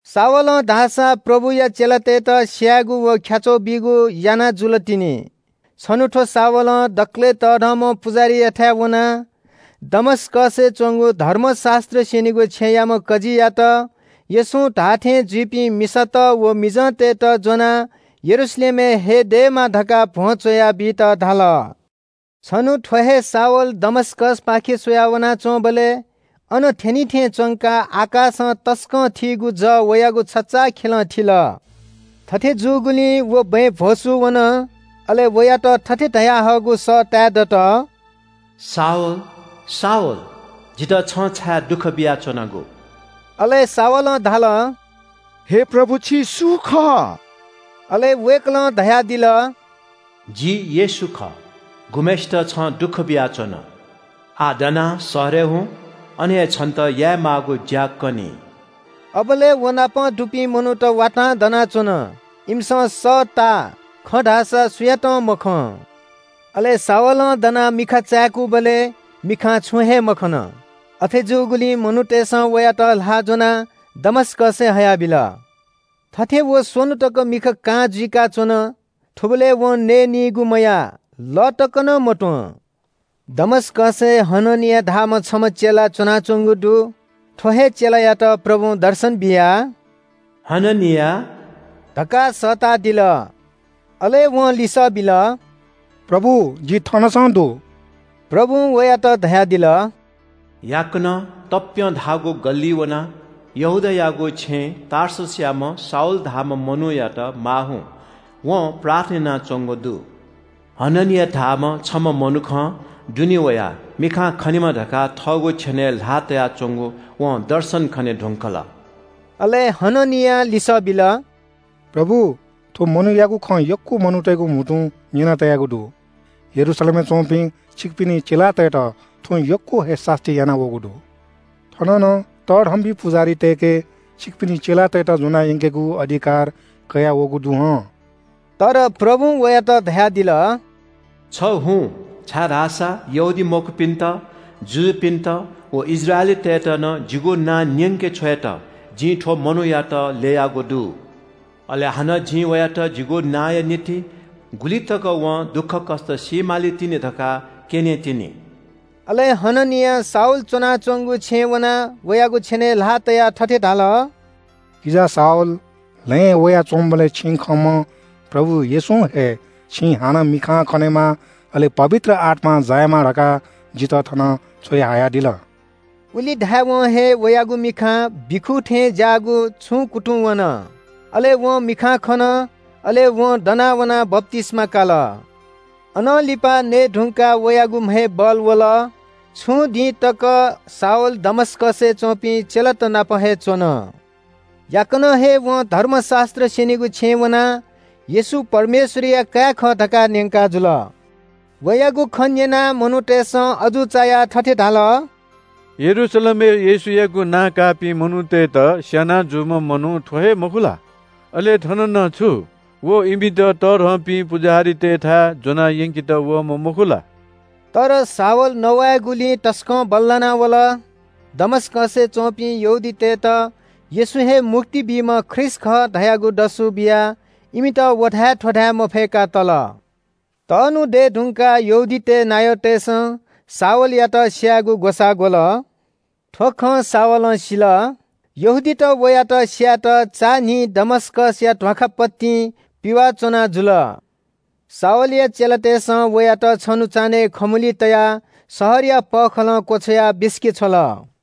शाऊलं धाःसा प्रभुया चेलातय्‌त स्‍यायेगु व ख्‍याच्‍वः बीगु याना जुल तिनि। छन्‍हु थ्‍व शाऊलं दकलय् तःधंम्‍ह पुजाहारीयाथाय् वनाः दमस्‍कसय् च्‍वंगु धर्मशास्‍त्र स्‍यनीगु छेँयाम्‍ह कजीयात येशूं धाःथें जुइपिं मिसात व मिजंतय्‌त ज्‍वनाः यरूशलेमय् हये दयेमा धकाः भ्‍वं च्‍वया बीत धाल। छन्‍हु थ्‍व हे शाऊल दमस्‍कसपाखे स्‍वया वनाच्‍वंबलय् अन थ्‍यनिथें च्‍वंकाः आकाशं तसकं थीगु जः वयागु छचाःखेलं थिल। थथे जूगुलिं व बँय् भ्‍वसू वन। अले वयात थथे धयाहःगु सः ताये दत – “शाऊल, शाऊल, जितः छं छाय् दुःख बियाच्‍वनागु?” अले शाऊलं धाल – “हे प्रभु, छि सु खः?” अले वय्‌कलं धयादिल – “जि येशू खः, गुम्‍हय्‌सित छं दुःख बियाच्‍वन। आः दनाः शहरय् हुँ, अन हे छन्‍त यायेमाःगु ज्‍या कनी।” अबलय् व नाप दुपिं मनूत वातां दनाच्‍वन। इमिसं सःताः, खँ धाःसा सुयातं मखं। अले शाऊलं दनाः मिखा चाय्‌कूबलय् मिखां छुं हे मखन। अथे जूगुलिं मनूतय्‌सं वयात ल्‍हाः ज्‍वनाः दमस्‍कसय् हयाबिल। थथे व स्‍वन्‍हु तक मिखा कां जुइकाच्‍वन। थुबलय् वं नयेनीगु मयाः, लः तक नं मत्‍वं। दमस्‍कसय् हननिया धाःम्‍ह छम्‍ह चेला च्‍वनाच्‍वंगु दु। थ्‍व हे चेलायात प्रभुं दर्शन बियाः – “हननिया” धकाः सःतादिल। अले वं लिसः बिल – “प्रभु, जि थनसं दु।” प्रभुं वयात धयादिल – “याकनं तप्‍यं धाःगु गल्‍लिइ वनाः यहूदायागु छेँय् टार्ससयाम्‍ह शाऊल धाःम्‍ह मनूयात माः हुँ। वं प्रार्थना यानाच्‍वंगु दु। हननिया धाःम्‍ह छम्‍ह मनुखं दुने वयाः मिखां खनेमा धकाः थःगु छेनय् ल्‍हाः तयाच्‍वंगु वं दर्शन खने धुंकल।” अले हननियां लिसः बिल – “प्रभु, थ्‍व मनूयागु खँ यक्‍व मनूतय्‌गु म्‍हुतुं न्‍यना तयागु दु। यरूशलेमय् च्‍वंपिं छिकपिनि चेलातय्‌त थ्‍वं यक्‍व हे सास्‍ती यानावःगु दु। थन नं तःधंपिं पुजाहारीतय्‌के छिकपिनि चेलातय्‌त ज्‍वनाः यंकेगु अधिकार कयाः वःगु दु हं।” तर प्रभुं वयात धयादिल – “छ हुँ छाय्‌धाःसा यहूदीमखुपिन्‍त, जुजुपिन्‍त व इस्राएलीतय्‌त नं जिगु नां न्‍यंके छ्वयेत जिं थ्‍व मनूयात ल्‍ययागु दु। अले हानं जिं वयात जिगु नांया निंतिं गुलि तक वं दुःखकष्‍ट सी मालीतिनि धकाः क्‍यनेतिनि।” अले हननियां शाऊल च्‍वनाच्‍वंगु छेँय् वनाः वयागु छेनय् ल्‍हाः तयाः थथे धाल – “किजा शाऊल, लँय् वयाच्‍वंबलय् छिं खंम्‍ह प्रभु येशूं हे छिं हानं मिखां खनेमा, अले पवित्र आत्‍मां जायेमा धकाः जितः थन छ्वयाहयादिल।” उलि धायेवं हे वयागु मिखां बिखू थें ज्‍याःगु छुं कुतुंवन, अले वं मिखां खन। अले वं दना वनाः बप्‍तिस्‍मा काल। अनं लिपा नये धुंकाः वयागु म्‍हय् बल वल। छुं दिंतक शाऊल दमस्‍कसय् च्‍वंपिं चेलात नाप हे च्‍वन। याकनं हे वं धर्मशास्‍त्र स्‍यनीगु छेँय् वनाः – “येशू परमेश्‍वरया काय् खः” धकाः न्‍यंकाजुल। वयागु खँ न्‍यनाः मनूतय्‌सं अजू चायाः थथे धाल – “यरूशलेमय् येशूयागु नां काःपिं मनूतय्‌त स्‍याना जूम्‍ह मनू थ्‍व हे मखु ला? अले थन नं छु व इमित तःधंपिं पुजाहारीतय्‌थाय् ज्‍वना यंकेत वःम्‍ह मखु ला?” तर शाऊल नवायेगुलिइ तसकं बल्‍लाना वल। दमस्‍कसय् च्‍वंपिं यहूदीतय्‌त येशू हे मुक्ति बीम्‍ह ख्रीष्‍ट खः धयागु दसु बियाः इमित व धाये थ्‍व धाये मफय्‌का तल। तःन्‍हु दये धुंकाः यहूदीतय् नायःतय्‌सं शाऊलयात स्‍यायेगु ग्‍वसाः ग्‍वल। थ्‍व खँ शाऊलं सिल। यहूदीत वयात स्‍यायेत चान्‍हिं दमस्‍कसया ध्‍वाखा पतिं पिवाः च्‍वना जुल। शाऊलया चेलातय्‌सं वयात छन्‍हु चान्‍हय् खमुली तयाः शहरया पःखालं क्‍वछ्वयाः बिसिकेछ्वल।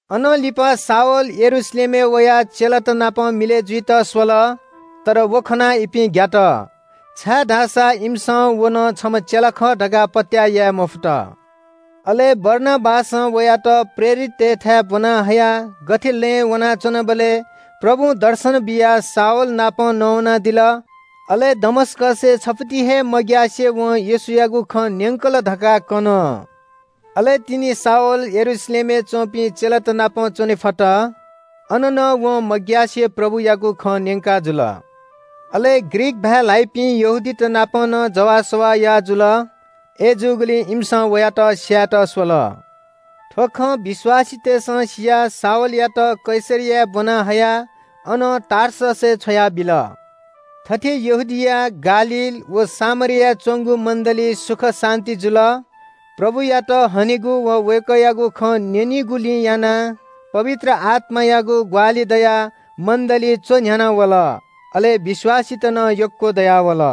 अनं लिपा शाऊल यरूशलेमय् वयाः चेलात नाप मिलय् जुइत स्‍वल, तर व खनाः इपिं ग्‍यात, छाय्‌धाःसा इमिसं व नं छम्‍ह चेला खः धकाः पत्‍याः याये मफुत। अले बारनाबासं वयात प्रेरिततय्‌थाय् ब्‍वना हयाः गथे लँय् वनाच्‍वंबलय् प्रभुं दर्शन बियाः शाऊल नाप नवानादिल, अले दमस्‍कसय् छफुति हे मग्‍यासे वं येशूयागु खँ न्‍यंकल धकाः कन। अले तिनि शाऊल यरूशलेमय् च्‍वंपिं चेलात नाप च्‍वने फत। अन नं वं मग्‍यासे प्रभुयागु खँ न्‍यंकाजुल। अले ग्रीक भाय् ल्‍हाइपिं यहूदीत नाप नं जवाःसवाः याः जुल। अय्‌जूगुलिं इमिसं वयात स्‍यायेत स्‍वल। थ्‍व खँ विश्‍वासीतय्‌सं सियाः शाऊलयात कैसरियाय् ब्‍वना हयाः अनं टार्ससय् छ्वयाबिल। थथे यहूदिया, गालील व सामरियाय् च्‍वंगु मण्‍डलीइ सुख शान्‍ति जुल। प्रभुयात हनेगु व वय्‌कःयागु खँ न्‍यनिगुलिं यानाः पवित्र आत्‍मायागु ग्‍वाहालि दयाः मण्‍डली च्‍वन्‍ह्याना वल, अले विश्‍वासीत नं यक्‍व दयावल।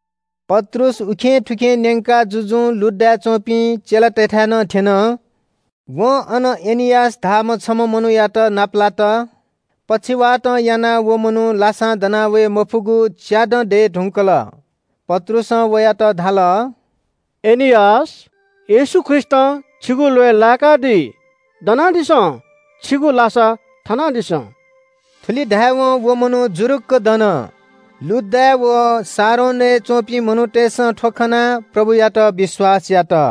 पत्रुस उखेंथुखें न्‍यंका जुजुं लुड्डाय् च्‍वंपिं चेलातय्‌थाय् नं थ्‍यन। वं अन एनियास धाःम्‍ह छम्‍ह मनूयात नापलात। पक्षवातं यानाः व मनू लासां दनावये मफुगु च्‍यादँ दये धुंकल। पत्रुसं वयात धाल – “एनियास, येशू ख्रीष्‍टं छिगु ल्‍वय् लाय्‌कादी। दनादिसँ, छिगु लासा थनादिसँ।” थुलि धायेवं व मनू जुरुक्‍क दन। लुड्डाय् व शारोनय् च्‍वंपिं मनूतय्‌सं थ्‍व खनाः प्रभुयात विश्‍वास यात।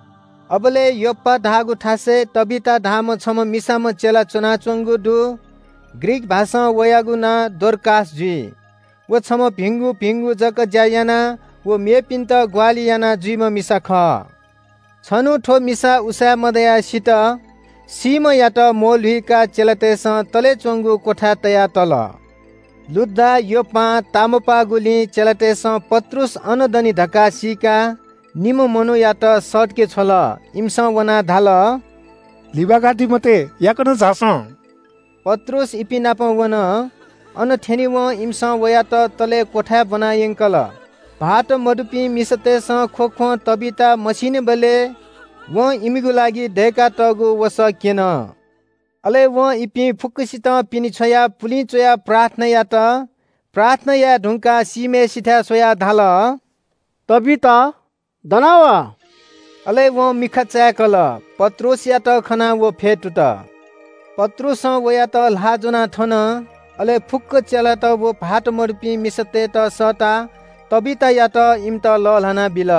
अबलय् योप्‍पा धाःगु थासय् तबीता धाःम्‍ह छम्‍ह मिसाम्‍ह चेला च्‍वनाच्‍वंगु दु। ग्रीक भाषां वयागु नां डोरकास जुइ। व छम्‍ह भिंगु भिंगु जक ज्‍या याना व मेपिन्‍त ग्‍वाहालि यानाजुइम्‍ह मिसा खः। छन्‍हु थ्‍व मिसा उसाँय् मदयाः सित। सीम्‍हयात म्‍वःल्‍हुकाः चेलातय्‌सं तले च्‍वंगु क्‍वथाय् तया तल। लुड्डा योप्‍पां तामपाःगुलिं चेलातय्‌सं पत्रुस अन दनि धकाः सीकाः निम्‍ह मनूयात सःतके छ्वल। इमिसं वनाः धाल – “लिबाकादी मते, याकनं झासँ।” पत्रुस इपिं नाप वन। अन थ्‍यनेवं इमिसं वयात तले क्‍वथाय् ब्‍वनायंकल। भाःत मदुपिं मिसातय्‌सं ख्‍वख्‍वं तबीता मसीनिबलय् वं इमिगु लागि दय्‌कातःगु वसः क्‍यन। अले वं इपिं फुक्‍कसितं पिने छ्वयाः पुलिं चुयाः प्रार्थना यात। प्रार्थना याये धुंकाः सीम्‍हय्‌सिथाय् स्‍वयाः धाल “तबीता, दना वा।” अले वं मिखा चाय्‌कल, पत्रुसयात खनाः व फ्‍यतुत। पत्रुसं वयात ल्‍हाः ज्‍वनाः थन। अले फुक्‍क चेलात व भाःत मदुपिं मिसातय्‌त सःताः तबीतायात इमित लःल्‍हाना बिल।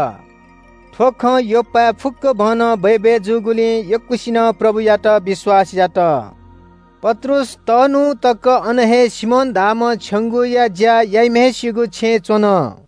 थ्‍व खँ योप्‍पाय् फुक्‍कभनं बय्‌बय् जूगुलिं यक्‍वसिनं प्रभुयात विश्‍वास यात। पत्रुस तःन्‍हु तक अन हे सिमोन धाःम्‍ह छेंगूया ज्‍या याइम्‍हय्‌सिगु छेँय् च्‍वन।